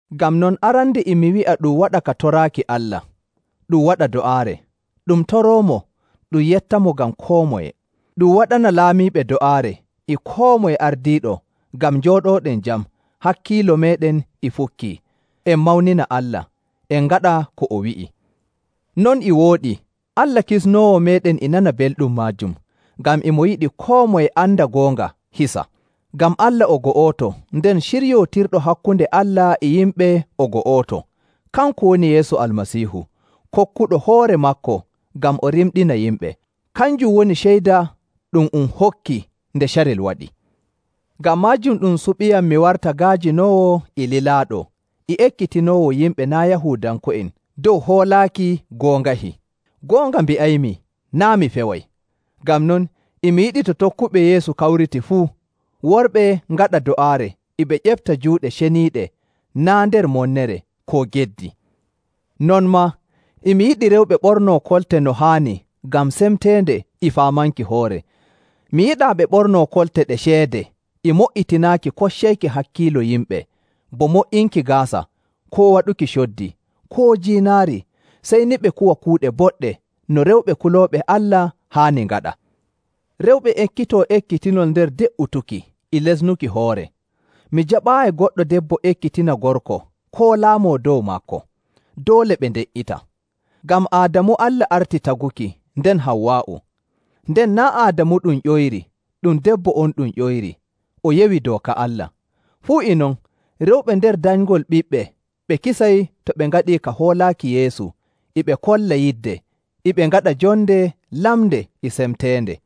Ngam non, arande e mi wi'a ɗum waɗa ka toraaki Allah, ɗum waɗa do'aare, ɗum toroomo, ɗum yettamo ngam koo moye. Ɗum waɗana laamiiɓe do'aare, e koo moye ardiiɗo ngam njooɗooɗen jam hakkiilo meeɗen e fukkii, en mawnina Allah, en ngaɗa ko o wi'i. Non e wooɗi. Allah Kisnoowo meeɗen e nana belɗum maajum, ngam e mo yiɗi koo moye anda goonga hisa. Ngam Allah o go'oto, nden ciryootirɗo hakkunde Allah e yimɓe o go'oto. Kanko woni Yeesu Almasiihu, kokkuɗo hoore maako ngam o rimɗina yimɓe. Kanjum woni ceyda ɗum um hokki nde carel waɗi. Ngam maajum ɗum suɓiiyam mi warta ga'ajinoowo e lilaaɗo e ekkitinoowo yimɓe naa' Yahuudanko'en dow hoolaaki goongahi. Goonga mbi'aymi, naa' mi feway! Ngam non e mi yiɗi to tokkuɓe Yeesu kawriti fuu, worɓe ngaɗa do'aare e ɓe ƴefta juuɗe ceniiɗe naa' nder monnere koo geddi. Non maa, e mi yiɗi rewɓe ɓornoo kolte no haani ngam semteende e faamanki hoore. Mi yiɗaa ɓe ɓornoo kolte ɗe ceede e mo''itinaaki koccayki hakkiilo yimɓe bo mo''inki gaasa, koo waɗuki coddi, koo jiinaari, sey ni ɓe kuwa kuuɗe boɗɗe no rewɓe kulooɓe Allah haani ngaɗa. Rewɓe ekkitoo ekkitinol nder de''utuki e lesnuki hoore. Mi jaɓaayi goɗɗo debbo ekkitina gorko koo laamoo dow maako; doole ɓe nde''ita. Ngam Aadamu Allah arti taguki, nden Hawwaa'u. Nden naa' Aadamu ɗum ƴoyri, ɗum debbo on ɗum ƴoyri, o yewi dooka Allah. Fuu e non, rewɓe nder danyngol ɓiɓɓe ɓe kisay to ɓe ngaɗii ka hoolaaki Yeesu e ɓe kolla yidde e ɓe ngaɗa jonde lamnde e semteende.